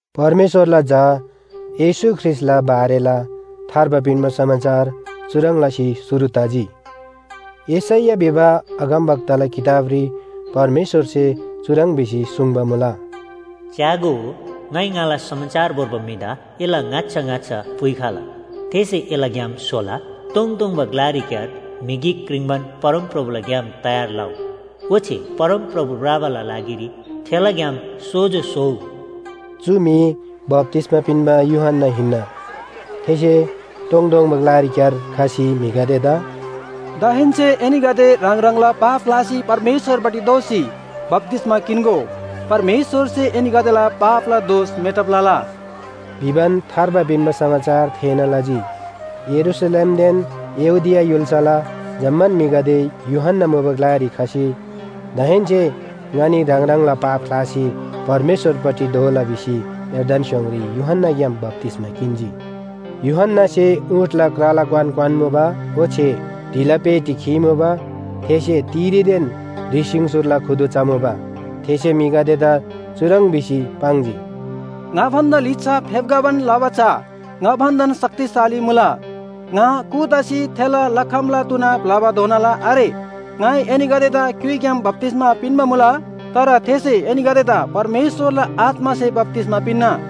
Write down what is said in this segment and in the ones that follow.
परमेश्‍वरला झा येशू ख्रीष्‍टला बारेला थार्बा पिन्‍बा समाचार चुह्रङ् लसी शुरु तजी। यशैया भिबा अगमवक्ताला किताबरी परमेश्‍वरसे चुह्रङ् भिसी सुङ्बा मुला, “च्‍यागो, ङाइ ङाला समाचार भोर्बा म्‍हिदा एला ङाच्‍छा ङाच्‍छा पुइखला। थेसे एला ग्‍याम स्‍होला। तोङतोङबा ग्‍लारीक्‍यार म्‍हि गिक क्रिङ्बान, ‘परमप्रभुला ग्‍याम तयार लउ, ओच्‍छे परमप्रभु भ्रबाला लागिरी थेला ग्‍याम सोजो स्‍होउ।” चु म्‍हि बप्‍तिस्‍मा पिन्‍बा यूहन्‍ना हिन्‍ना। थेसे तोङतोङबा ग्‍लारीक्‍यार खसी म्‍हिगदेदा “दाहेन्‍से एनीगदे ह्राङ ह्राङला पाप ख्‍लासी परमेश्‍वरपट्टि दोःसी बप्‍तिस्‍मा किन्‍गो। परमेश्‍वरसे एनीगदेला पापला दोष मेटब लला।” भिबान थार्बा पिन्‍बा समाचार थेःना लजी। यरूशलेमदेन यहूदिया य्‍हुल्‍साला जम्‍मान म्‍हिगदे यूहन्‍ना मुबा ग्‍लारी खसी, दाहेन्‍से ङनी ह्राङ ह्राङला पाप ख्‍लासी परमेश्‍वरपट्टि दोःला भिसी यर्दन स्‍योङरी यूहन्‍नाग्‍याम बप्‍तिस्‍मा किन्‍जी। यूहन्‍नासे ऊँटला क्राला क्‍वान क्‍वान्‍मुबा ओच्‍छे ढिला पेटी खीमुबा। थेसे तिरीदेन ह्रि सिङसोरला खुदु चमुबा। थेसे म्‍हिगदेदा चुह्रङ् भिसी पाङ्जी, “ङा भन्‍दा लिच्‍छा फेप्‍खबान लबा चा ङा भन्‍दान शक्तिशाली मुला। ङा कू तसी थेला लखमला तुना ब्‍लबाधोनाला आरे। ङाइ एनीगदेदा क्‍युइग्‍याम बप्‍तिस्‍मा पिन्‍बा मुला, तर थेसे एनीगदेदा परमेश्‍वरला आत्‍मासे बप्‍तिस्‍मा पिन्‍ना।”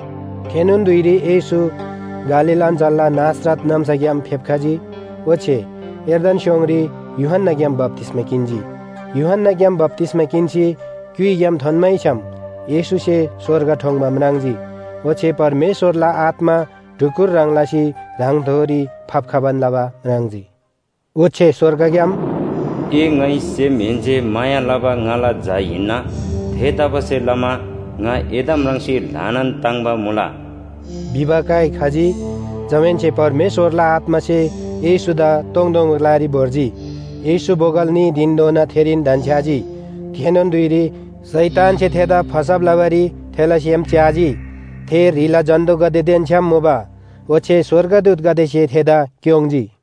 थेनोन धुइरी येशू गालील अञ्‍चलला नासरत नाम्‍साग्‍याम फेप्‍खजी, ओच्‍छे यर्दन स्‍योङरी यूहन्‍नाग्‍याम बप्‍तिस्‍मा किन्‍जी। यूहन्‍नाग्‍याम बप्‍तिस्‍मा किन्‍सी क्‍युइग्‍याम थोन्‍मैछ्‌याम येशूसे स्‍वर्ग ठोङ्‌बा म्राङ्जी ओच्‍छे परमेश्‍वरला आत्‍मा ढुकुर ह्रङ् लसी ह्राङथोरी फाप्‍खबान लबा म्राङ्जी। ओच्‍छे स्‍वर्गग्‍याम “ए ङाइ सेमहेन्‍से माया लबा ङाला झा हिन्‍ना, थेतबासेलमा ङा एदा म्राङ्सी ल्‍हानान ताङ्‍बा मुला” भिबा काइ खजी। जमाहेन्‍से परमेश्‍वरला आत्‍मासे येशूदा तोङतोङबा ग्‍लारी भोर्जी। येशू बोगल न्‍ही धिनधोना थेरीन धन्‍छ्‌याजी। थेनोन धुइरी शैतानसे थेदा फसब लबारी थेला सेम च्‍याजी। थे ह्रीला जन्‍तुगदेदेन छ्‌याम मुबा ओच्‍छे स्‍वर्गदूतगदेसे थेदा क्‍योङ्‌जी।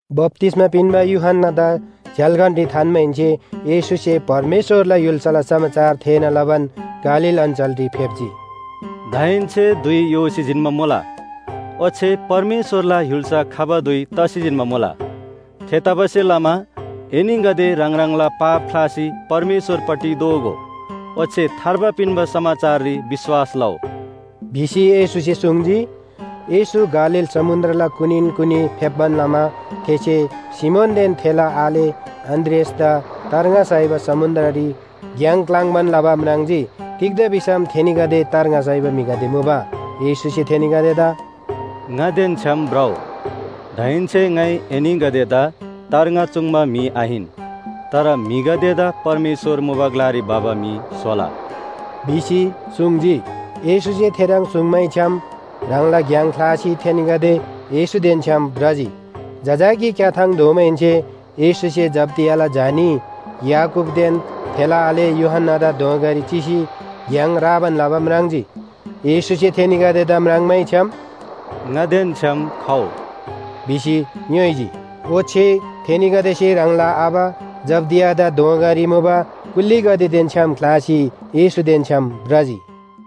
बप्‍तिस्‍मा पिन्‍बा यूहन्‍नादा झ्‍याल्‍खानरी थान्‍माहेन्‍से येशूसे परमेश्‍वरला य्‍हुल्‍साला समाचार थेःना लबान गालील अञ्‍चलरी फेप्‍जी। “दाहेन्‍से धुइ योसी जिन्‍बा मुला, ओच्‍छे परमेश्‍वरला य्‍हुल्‍सा खबा धुइ तसी जिन्‍बा मुला। थेतबासेलमा एनीगदे ह्राङ ह्राङला पाप ख्‍लासी परमेश्‍वरपट्टि दोःगो। ओच्‍छे थार्बा पिन्‍बा समाचाररी विश्‍वास लउ” भिसी येशूसे सुङ्जी। येशू गालील समुन्‍द्रला कुनीन कुनी फेप्‍बान लमा थेसे सिमोनदेन थेला आले अन्‍द्रियासदा तार्ङा साइबारी समुन्‍द्ररी घ्‍याङ क्‍लाङ्बान लबा म्राङ्जी। तिग्‍दा भिसम थेनीगदे तार्ङा साइबा म्‍हिगदे मुबा। येशूसे थेनीगदेदा “ङादेन छ्‌याम भ्रउ, दाहेन्‍से ङाइ एनीगदेदा तार्ङा चुङ्बा म्‍हि आहिन, तर म्‍हिगदेदा परमेश्‍वर मुबा ग्‍लारी भबा म्‍हि स्‍होला” भिसी सुङ्जी। येशूसे थेह्रङ् सुङ्मैछ्‌याम ह्राङला घ्‍याङ ख्‍लासी थेनीगदे येशूदेन छ्‌याम भ्रजी। जजाकी क्‍याथाङ धोमाहेन्‍से येशूसे जब्‍दियाला झा न्‍ही, याकूबदेन थेला आले यूहन्‍नादा दोँगारी चिसी घ्‍याङ राबान लबा म्राङ्जी। येशूसे थेनीगदेदा म्राङ्मैछ्‍याम “ङादेन छ्‌याम खउ” भिसी ङ्‌योइजी, ओच्‍छे थेनीगदेसे ह्राङला आबा जब्‍दियादा दोँगारी मुबा कुल्‍लीगदेदेन छ्‌याम ख्‍लासी येशूदेन छ्‌याम भ्रजी।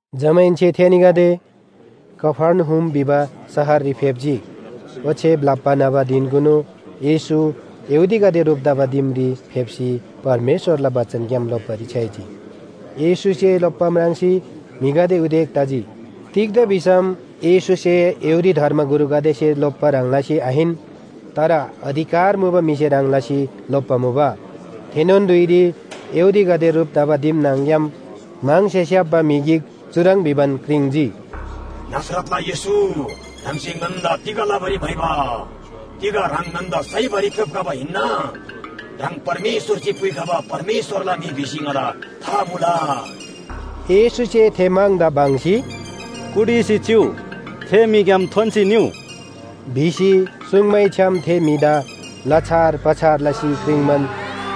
जमाहेन्‍से थेनीगदे कफर्नहुम भिबा शहररी फेप्‍जी। ओच्‍छे ब्‍लप्‍बा न्‍हबा धिनकुनु येशू यहूदीगदे ह्रुप तबा दिमरी फेप्‍सी परमेश्‍वरला बचनग्‍याम लोप्‍बारी छ्‌याइजी। येशूसे लोप्‍बा म्राङ्सी म्‍हिगदे उदेक तजी। तिग्‍दा भिसम येशूसे यहूदी धर्मगुरुगदेसे लोप्‍बा ह्रङ् लसी आहिन, तर अधिकार मुबा म्‍हिसे ह्रङ् लसी लोप्‍बा मुबा। थेनोन धुइरी यहूदीगदे ह्रुप तबा दिम न्‍हङ‍ग्‍याम म्‍हङसे स्‍याप्‍बा म्‍हि गिक चुह्रङ् भिबान क्रिङ्‌जी, “नासरतला येशू, ह्राङसे ङन्‍दा तिग लबारी म्‍हाइबा? तिग ह्राङ ङन्‍दा साइबारी फेप्‍खबा हिन्‍ना? ह्राङ परमेश्‍वरसे पुइखबा परमेश्‍वरला म्‍हि भिसी ङादा था मुला।” येशूसे थे म्‍हङदा बङ्‌सी, “कुटिसी चिउ! थे म्‍हिग्‍याम थोन्‍सी निउ!” भिसी सुङ्मैछ्‌याम थे म्‍हिदा लछार पछार लसी क्रिङ्बान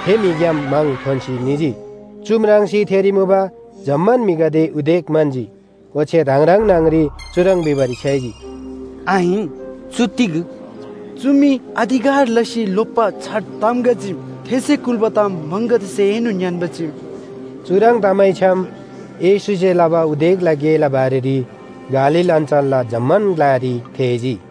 थे म्‍हिग्‍याम म्‍हङ थोन्‍सी निजी। चु म्राङ्सी थेरी मुबा जम्‍मान म्‍हिगदे उदेक म्‍हन्‍जी। ओच्‍छे ह्राङ ह्राङ न्‍हङरी चुह्रङ् भिबारी छ्‌याइजी, “आहिन, चु तिग? चु मी अधिकार लसी लोप्‍बा छार ताम गा चीम। थेसे कुल्‍बा ताम म्‍हङगदेसेएनोन ङ्‌यान्‍बा चीम।” चुह्रङ् तमैछ्‌याम येशूसे लबा उदेकला गेला बारेरी गालील अञ्‍चलला जम्‍मान ग्‍लारी थेःजी।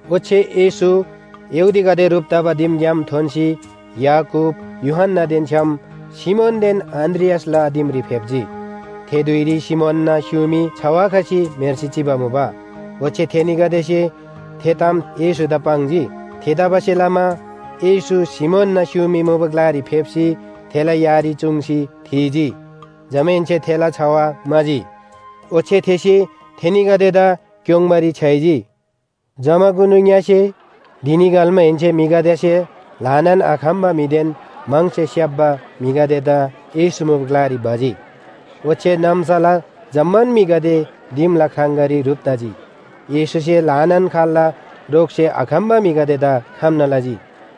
ओच्‍छे येशू यहूदीगदे ह्रुप तबा दिमग्‍याम थोन्‍सी याकूब, यूहन्‍नादेन छ्‌याम सिमोनदेन अन्‍द्रियासला दिमरी फेप्‍जी। थे धुइरी सिमोनना स्‍युमी छवा खसी म्‍हेर्सी चिबा मुबा। ओच्‍छे थेनीगदेसे थे ताम येशूदा पाङ्जी। थेतबासेलमा येशू सिमोनना स्‍युमी मुबा ग्‍लारी फेप्‍सी थेला यारी चुङ्सी थीजी। जमाहेन्‍से थेला छवा म्‍हाजी। ओच्‍छे थेसे थेनीगदेदा क्‍योङ्बारी छ्‌याइजी। जमाकुनु ङ्‍यसे धिनी घल्‍माहेन्‍से म्‍हिगदेसे ल्‍हानान आखम्‍बा म्‍हिदेन म्‍हङसे स्‍याप्‍बा म्‍हिगदेदा येशू मुबा ग्‍लारी भजी। ओच्‍छे नाम्‍साला जम्‍मान म्‍हिगदे दिमला ख्राङगारी ह्रुप तजी। येशूसे ल्‍हानान खाल्‍ला रोगसे आखम्‍बा म्‍हिगदेदा खम्‍ना लजी।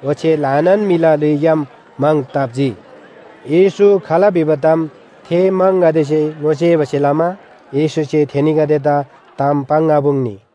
ओच्‍छे ल्‍हानान म्‍हिला ल्‍हुइग्‍याम म्‍हङ ताप्‍जी। येशू खाल भिबा ताम थे म्‍हङगदेसे ङोसेबासे लमा येशूसे थेनीगदेदा ताम पाङ्आपुङ्नी।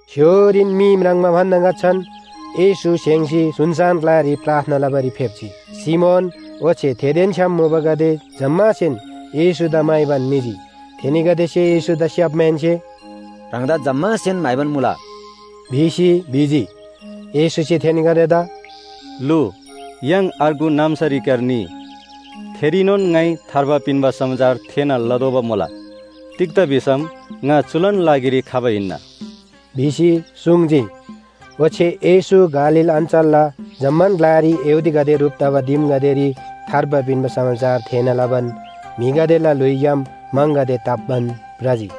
स्‍य्‍होरीन मी म्राङ्बा भन्‍दा ङाच्‍छान येशू स्‍हेङ्‌सी सुनसान ग्‍लारी प्रार्थना लबारी फेप्‍जी। सिमोन ओच्‍छे थेदेन छ्‌याम मुबागदे जम्‍मासेन येशूदा म्‍हाइबान निजी। थेनीगदेसे येशूदा स्‍याप्‍माहेन्‍से “ह्राङदा जम्‍मासेन म्‍हाइबान मुला” भिसी भिजी। येशूसे थेनीगदेदा “लु, य्‍हाङ अर्गु नाम्‍सारीक्‍यार निइ, थेरीनोन ङाइ थार्बा पिन्‍बा समाचार थेःना लतोःबा मुला। तिग्‍दा भिसम ङा चुलान लागिरी खबा हिन्‍ना” भिसी सुङ्जी। ओच्‍छे येशू गालील अञ्‍चलला जम्‍मान ग्‍लारी यहूदीगदे ह्रुप तबा दिमगदेरी थार्बा पिन्‍बा समाचार थेःना लबान म्‍हिगदेला ल्‍हुइग्‍याम म्‍हङगदे ताप्‍बान भ्रजी।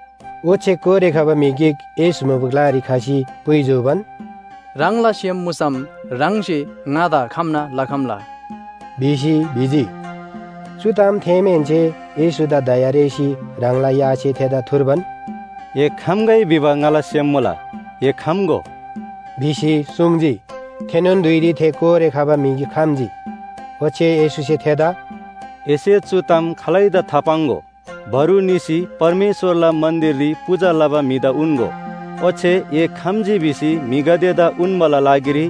ओच्‍छे कोरे खबा म्‍हि गिक येशू मुबा ग्‍लारी खसी पुइ जूबान, “ह्राङला सेम मुसम ह्राङसे ङादा खम्‍ना लखम्‍ला” भिसी भिजी। चु ताम थेःमाहेन्‍से येशूदा दया रेःसी ह्राङला यासे थेदा थुर्बान, “ए खम्‍गै भिबा ङाला सेम मुला, ए खम्‍गो” भिसी सुङ्जी। थेनोन धुइरी थे कोरे खबा म्‍हि खम्‍जी। ओच्‍छे येशूसे थेदा “एसे चु ताम खालैदा थापाङ्‍गो, बरु निसी परमेश्‍वरला मन्‍दिररी पूजा लबा म्‍हिदा उन्‍गो। ओच्‍छे ए खम्‍जी भिसी म्‍हिगदेदा उन्‍बाला लागिरी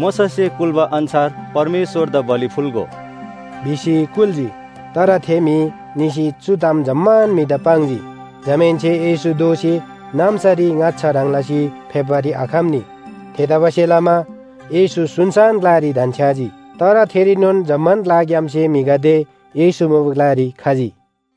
मोशासे कुल्‍बा अन्‍छार परमेश्‍वरदा बलि फुल्‍गो” भिसी कुल्‍जी। तर थे म्‍हि निसी चु ताम जम्‍मान म्‍हिदा पाङ्जी। जमाहेन्‍से येशू दोःसी नाम्‍सारी ङाच्‍छाला ह्रङ् लसी फेप्‍बारी आखम्‍नी। थेतबासेलमा येशू सुनसान ग्‍लारी धन्‍छ्‌याजी। तर थेरीनोन जम्‍मान ग्‍लाग्‍यामसे म्‍हिगदे येशू मुबा ग्‍लारी खजी।